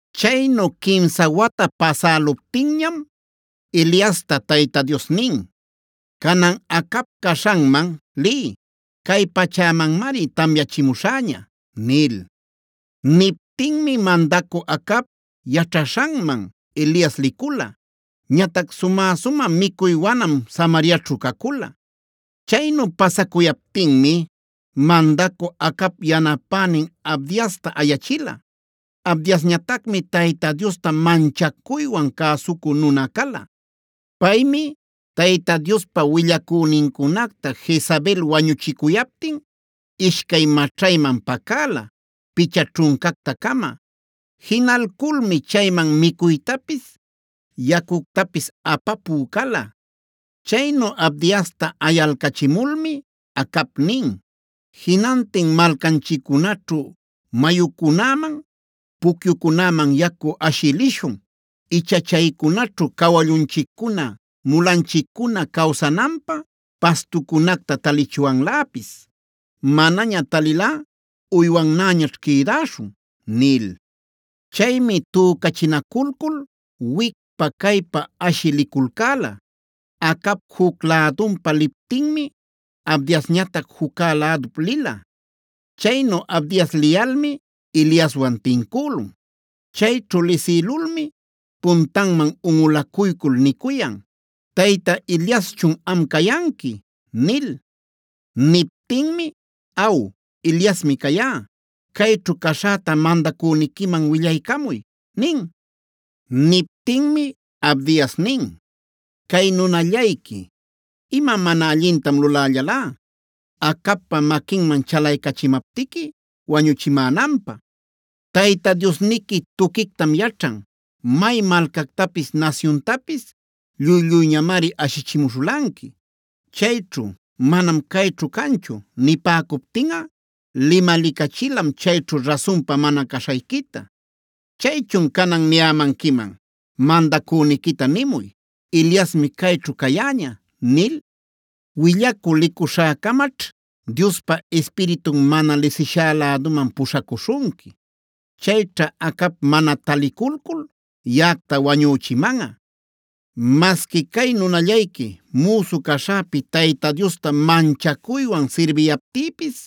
Chaynu quimsa wata pasäluptinñam Eliasta Tayta Dios nin: “Canan Acab caśhanman liy. Cay pachämanmari tamyachimuśhäña” nil. Niptinmi mandacü Acab yaćhaśhanman Elias licula. Ñatac sumä-sumä micuy wanam Samariaćhu cacula. Chaynu pasacuyaptinmi mandacü Acab yanapänin Abdiasta ayachila. Abdiasñatacmi Tayta Diosta manchacuywan cäsucü nuna cala. Paymi Tayta Diospa willacünincunacta Jezabel wañuchicuyaptin ishcay maćhayman pacäla, picha ćhuncacta-cama. Jinalculmi chayman micuytapis, yacuctapis apapü cala. Chaynu Abdiasta ayalcachimulmi Acab nin: “Jinantin malcanchiccunaćhu mayucunäman, pucyucunäman yacu ashï lishun. Icha chaycunaćhu cawallunchiccuna, mulanchiccuna cawsananpä pastucunacta talichwanläpis. Manaña talilꞌa uywannäñaćh quïdäśhun” nil. Chaymi tücachinaculcul wicpa caypa ashï liculcäla. Acab juc lädunpa liptinmi Abdiasñatac juccä ladup lila. Chaynu Abdias liyalmi Eliaswan tincülun. Chayćhu lisïlulmi puntanman unꞌulacuycul nicuyan: “¿¡Tayta Eliaschun am cayanqui!?” nil. Niptinmi: “Aw, Eliasmi cayá. Cayćhu caśhäta mandacüniquiman willaycamuy” nin. Niptinmi Abdias nin: “Cay nunallayqui, ¿ima mana allintam lulällalá, Acabpa maquinman chalaycachimaptiqui wañuchimänanpä? Tayta Diosniqui tuquictam yaćhan; may malcactapis nasyuntapis lluy-lluyñamari ashichimuśhulanqui. Chayćhu: ‘Manam cayćhu canchu’ nipäcuptinꞌa limalicachilam chayćhu rasunpa mana caśhayquita. Chaychun canan niyämanquiman: ‘Mandacüniquita nimuy, Eliasmi cayćhu cayäña’ nil. Willacü licuśhäcamaćh Diospa Ispiritun mana lisishá läduman puśhacuśhunqui.a Chayćha Acab mana taliculcul yaꞌacta wañüchimanꞌa, masqui cay nunallayqui müsu caśhäpi Tayta Diosta manchacuywan sirbiyaptïpis.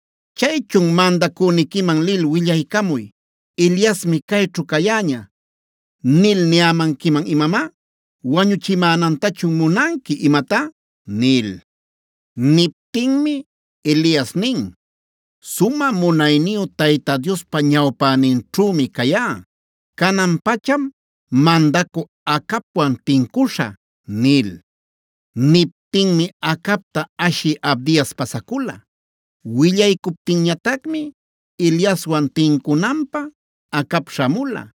Chaychun, ¿mandacüniquiman lil willaycamuy ‘Eliasmi caychu cayäña’ nil niyämanquiman imamá? ¿Wañuchimänantachun munanqui imatá?” nil. Niptinmi Elias nin: “Sumä munayniyu Tayta Diospa ñawpäninćhümi cayá. Canan-pacham mandacü Acabwan tincuśhä” nil. Niptinmi Acabta ashï Abdias pasacula. Willaycuptinñatacmi Eliaswan tincunanpä Acab śhamula.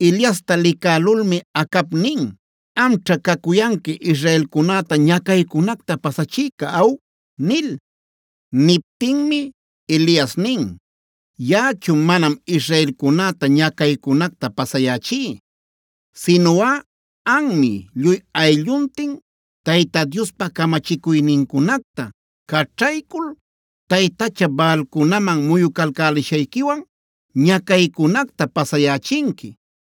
Eliasta licälulmi Acab nin: “¿Amćhá cacuyanqui israelcunäta ñacaycunacta pasachïca aw?” nil. Niptinmi Elias nin: “Yaꞌachu manam israelcunäta ñacaycunacta pasayächí. Sinuꞌa anmi lluy aylluntin Tayta Diospa camachicuynincunacta caćhaycul taytacha Baalcunaman muyucalcälishayquiwan ñacaycunacta pasayächinqui.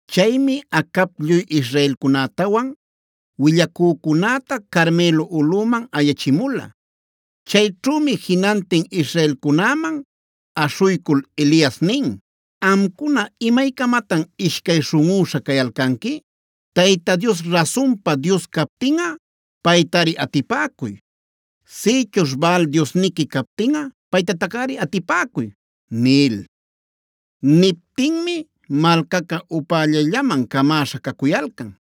Chaymi Acab lluy israelcunätawan willacücunäta Carmelo ulꞌuman ayachimula. Chayćhümi jinantin israelcunäman aśhuycul Elias nin: “¿Amcuna imaycamatan ishcay śhunꞌüśha cayalcanqui? Tayta Dios rasunpa Dios captinꞌa paytari atipäcuy; sïchuśh Baal Diosniqui captinꞌa paytatacꞌari atipäcuy” nil.b Niptinmi malcaca upällayllaman camäśha cacuyalcan.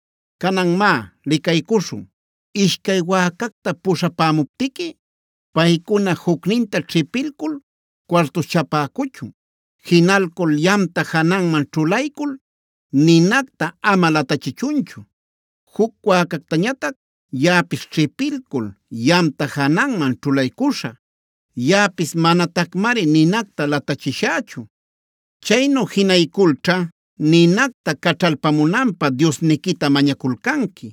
Canan má licaycuśhun: Ishcay wäcacta puśhapämuptiqui paycuna jucninta ćhipilcul cuartuśhchapäcuchun. Jinalcul yamta jananman ćhulaycul ninacta ama latachichunchu. Juc wäcactañatac yaꞌapis ćhipilcul yamta jananman ćhulaycuśhä; yaꞌapis manatacmari ninacta latachishächu. Chaynu jinayculćha ninacta caćhalpamunanpä diosniquita mañaculcanqui.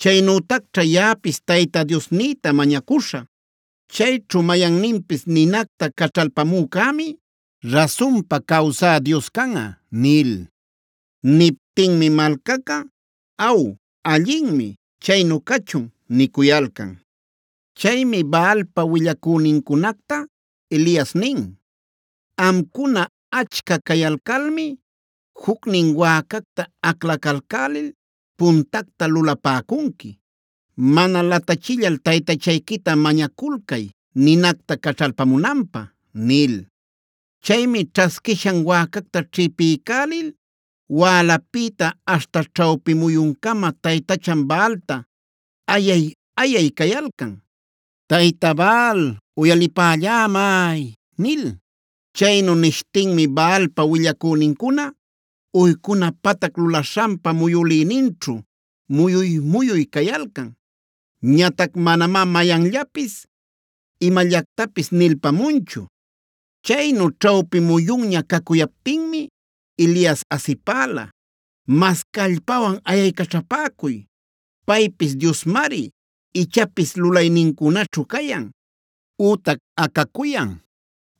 Chaynütacćha yaꞌapis Tayta Diosnïta mañacuśhä. Chayćhu mayanninpis ninacta caćhalpamücämi rasunpa cawsä Dios canꞌa” nil. Niptinmi malcaca: “Aw, allinmi. Chaynu cachun” nicuyalcan. Chaymi Baalpa willacünincunacta Elias nin: “Amcuna achca cayalcalmi jucnin wäcacta aclacalcälil puntacta lulapäcunqui. Mana latachillal taytachayquita mañaculcay ninacta caćhalpamunanpä” nil. Chaymi ćhasquishan wäcacta ćhipiycälil wälapïta aśhta ćhawpi muyuncama taytachan Baalta ayay-ayay cayalcan: “¡Tayta Baal, uyalipällämay!” nil. Chaynu nishtinmi Baalpa willacünincuna uycuna patac lulaśhanpa muyülïninćhu muyuy-muyuy cayalcan. Ñatac manamá mayanllapis imallactapis nilpamunchu. Chaynu ćhawpi muyunña cacuyaptinmi Elias asipäla: “Mas callpawan ayaycaćhapäcuy; paypis diosmari. Ichapis lulaynincunaćhu cayan, ütac acacuyan,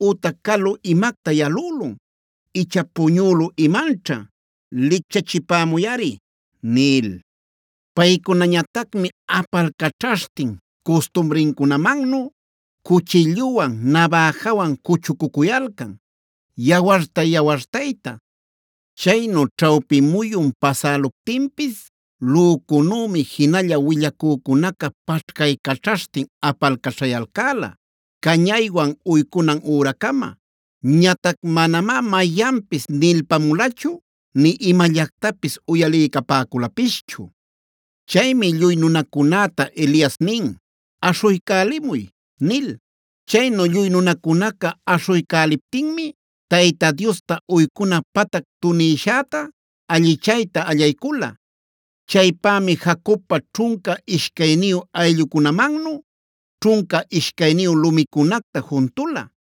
ütac calu imacta yalülun. ¡Icha puñülü imanćha, licchachipämuyꞌari!” nil. Paycunañatacmi apalcaćhaśhtin custumrincunamannu cuchilluwan, nabäjawan cuchucücuyalcan yawartay-yawartayta. Chaynu ćhawpi muyun pasäluptinpis lücunümi jinalla willacücunaca paćhcaycaćhaśhtin apalcaćhayalcäla, cañaywan uycunan üracama. Ñatac manamá mayanpis nilpamulachu nï imallactapis uyaliycapäculapischu. Chaymi lluy nunacunäta Elias nin: “Aśhuycälimuy” nil. Chaynu lluy nunacunaca aśhuycäliptinmi Tayta Diosta uycunan patac tunïshäta allichayta allaycula. Chaypämi Jacobpa ćhunca ishcayniyu ayllucunamannu ćhunca ishcayniyu lumicunacta juntula.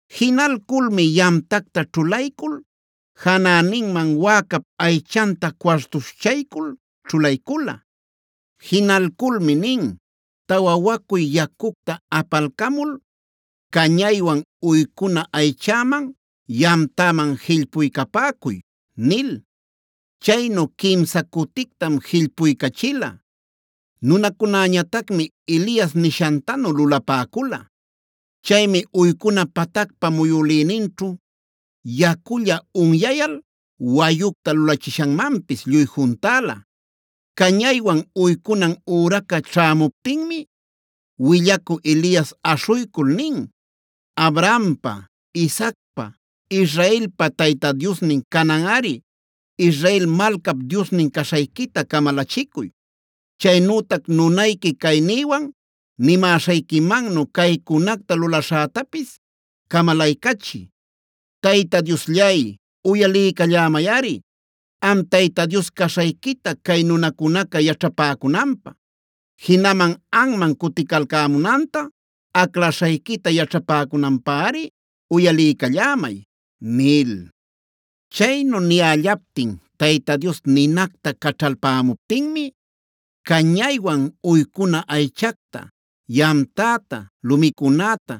Jinalculmi yamtacta ćhulaycul janäninman wäcap aychanta cuartuśhchaycul ćhulaycula. Jinalculmi nin: “Tawa wacuy yacucta apalcamul cañaywan uycuna aychäman, yamtäman jillpuycapäcuy” nil. Chaynu quimsa cutictam jillpuycachila. Nunacunäñatacmi Elias nishantanu lulapäcula. Chaymi uycuna patacpa muyülïninćhu yaculla unyayal wayucta lulachishanmanpis lluy juntäla. Cañaywan uycunan üraca ćhämuptinmi willacü Elias aśhuycul nin: “Abrahampa, Isaacpa, Israelpa Tayta Diosnin cananꞌari Israel malcap Diosnin caśhayquita camalachicuy. Chaynütac nunayqui caynïwan nimäśhayquimannu caycunacta lulaśhätapis camalaycachiy. Tayta Diosllay, uyaliycallämayꞌari. Am Tayta Dios caśhayquita cay nunacunaca yaćhapäcunanpä, jinaman anman cuticalcämunanta alcaśhayquita yaćhapäcunanpäri uyaliycallämay” nil. Chaynu niyällaptin Tayta Dios ninacta caćhalpämuptinmi cañaywan uycuna aychacta, yamtäta, lumicunäta,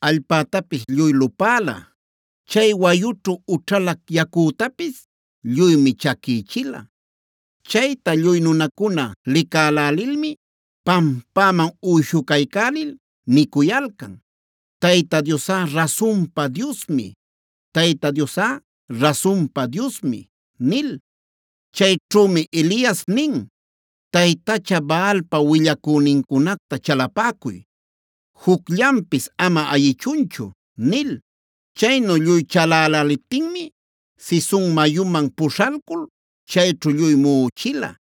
allpätapis lluy lupäla. Chay wayućhu ućhalä yacütapis lluymi chaquïchila. Chayta lluy nunacuna licälälilmi pampäman uyshucaycälil nicuyalcan: Tayta Diosꞌa rasunpa Diosmi; Tayta Diosꞌa rasunpa Diosmi” nil. Chayćhümi Elias nin: “Taytacha Baalpa willacünincunacta chalapäcuy. Jucllanpis ama ayichunchu” nil. Chaynu lluy chalaläliptinmi Cison mayuman pushalcul chayćhu lluy muꞌuchila.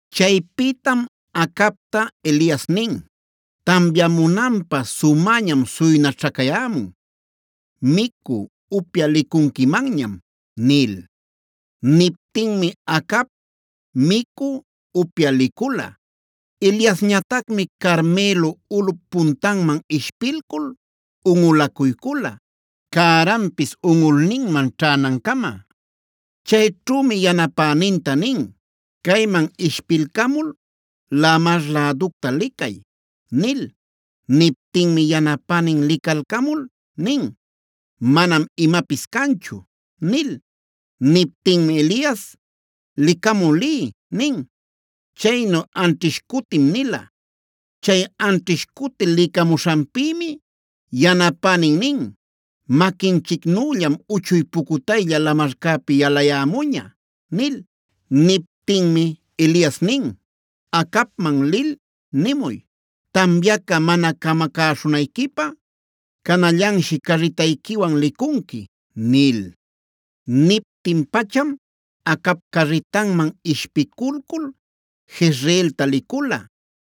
Chaypïtam Acabta Elias nin: “Tamyamunanpä sumäñam suynaćhacayämun; micü, upyä licunquimanñam” nil. Niptinmi Acab micü, upyä licula. Eliasñatacmi Carmelo ulꞌup puntanman ishpilcul unꞌulacuycula, cärantapis unꞌulninman ćhänancama. Chayćhümi yanapäninta nin: “Cayman ishpilcamul lamar läducta licay” nil. Niptinmi yanapänin licalcamul nin: “Manam imapis canchu” nil. Niptinmi Elias: “Licamü liy” nin. Chaynu anćhish cutim nila. Chay anćhish cuti licamuśhanpïmi yanapänin nin: “Maquinchicnüllam uchuy pucutaylla lamarcäpi yalayämuña” nil. Niptinmi Elias nin: “Acabman lil nimuy: ‘Tamyaca mana camacäśhunayquipä canallanshi carritayquiwan licunqui’” nil. Niptin pacham Acab carritanman ishpiculcul Jezreelta licula.